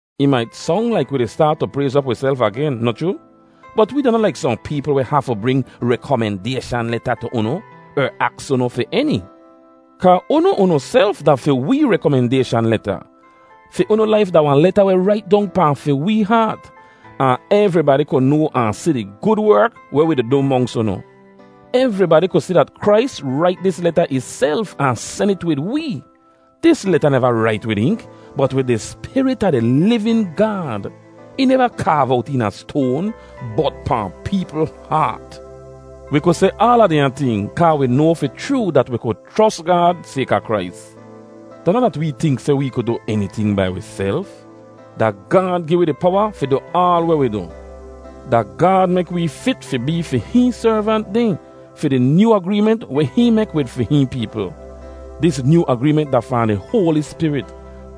Ih mait song laik wi di staat tu prayz op wiself agen, noh chroo? Bot wee da noh laik sohn peepl weh hafu bring rekomendayshan leta tu unu, er aks unu fi eni. Kaa unu unuself da fi wee rekomendayshan leta. Fi unu laif da wahn leta weh rait dong pahn fi wee haat, ahn evribadi ku noa ahn si di gud werk weh wi du monks unu. Evribadi ku si dat Krais rait dis leta ihself ahn sen it wid wee. Dis leta neva rait wid ink, bot wid di Spirit a di livin Gaad. Ih neva kaav owt eena stoan, bot pahn peepl haat. Wi ku seh aala dehnya ting kaa wi noa fi chroo dat wi ku chros Gaad sayka Krais. Da noh dat wee tink seh wee ku du eniting bai wiself; da Gaad gi wi di powa fi du aal weh wi du. Da Gaad mek wee fit fi bee fi hihn servant dehn fi di nyoo agreement weh hihn mek wid fi hihn peepl. Dis nyoo agreement da fahn di Hoali Spirit;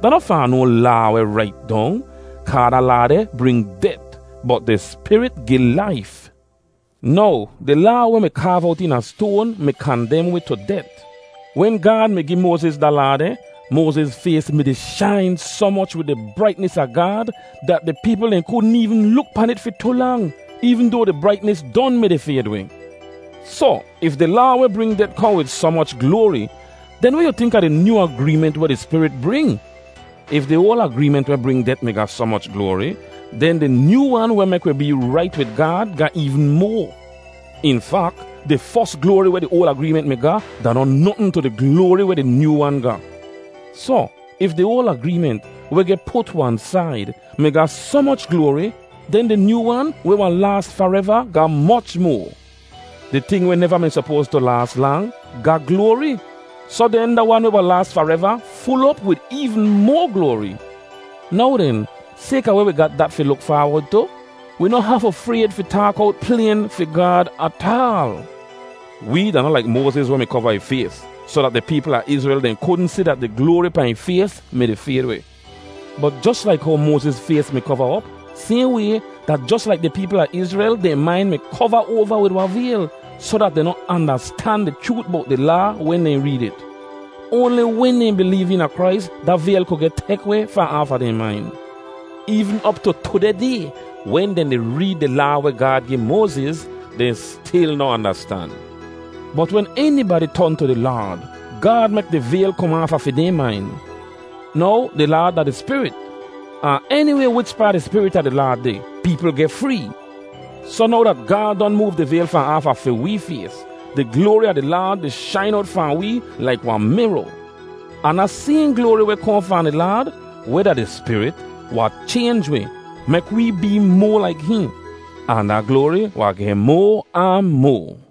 da noh fahn no laa weh rait dong. Kaa da Laa deh bring det, bot di Spirit gi laif. Now, di Laa weh mi kaav owt eena stoan mi kandem wi tu det. Wen Gaad mi gi Moaziz da Laa deh, Moaziz fays mi-di shain soh moch wid di braitnis a Gaad dat di peepl dehn kudn eevn luk pahn it fi tu lang, eevn doa di braitnis don mi-di fayd weh. Soh, if di Laa weh bring det kohn wid soh moch gloari, den weh yu tink a di nyoo agreement weh di Spirit bring? If di oal agreement weh bring det mi ga soh moch gloari, den di nyoo wan weh mek wi bee rait wid Gaad ga eevn moa! In fak, di fos gloari weh di oal agreement mi ga da noh notn tu di gloari weh di nyoo wan ga. Soh, if di oal agreement, weh geh put wan said, mi ga soh moch gloari, den di nyoo wan, weh wahn laas fareva, ga moch moa. Di ting weh neva mi sopoas tu laas lang, ga gloari. Soh den da wan weh wahn laas fareva ful op wid eevn moa gloari. Now den, sayka weh wi ga dat fi luk faawod tu, wi noh hafu frayd fi taak owt playn fi Gaad ataal. Wee da noh laik Moaziz weh mi kova ih fays soh dat di peepl a Izrel dehn kudn si dat di gloari pahn ih fays mi-di fayd weh. Bot jos laik how Moaziz fays mi kova op, sayhn way, da jos laik di peepl a Izrel dehn main mi kova oava wid wahn vayl, soh dat dehn noh andastan di chroot bowt di Laa wen dehn reed it. Oanli wen dehn bileev eena Krais da vayl ku geh tek weh fahn aafa dehn main. Eevn op tu tudeh day, wen dehn di reed di Laa weh Gaad gi Moaziz, dehn stil noh andastan. Bot wen enibadi ton tu di Laad, Gaad mek di vayl kom aafa fi dehn main. Now di Laad da di Spirit, ahn eniway wichpaa di Spirit a di Laad deh, peepl geh free. Soh now dat Gaad don moov di vayl fahn aafa fi wee fays, di gloari a di Laad di shain owt fahn wee laik wahn miro; ahn da sayhn gloari weh kohn fahn di Laad, weh da di Spirit, wahn chaynj wi, mek wee bee moa laik hihn, ahn da gloari wahn geh moa ahn moa.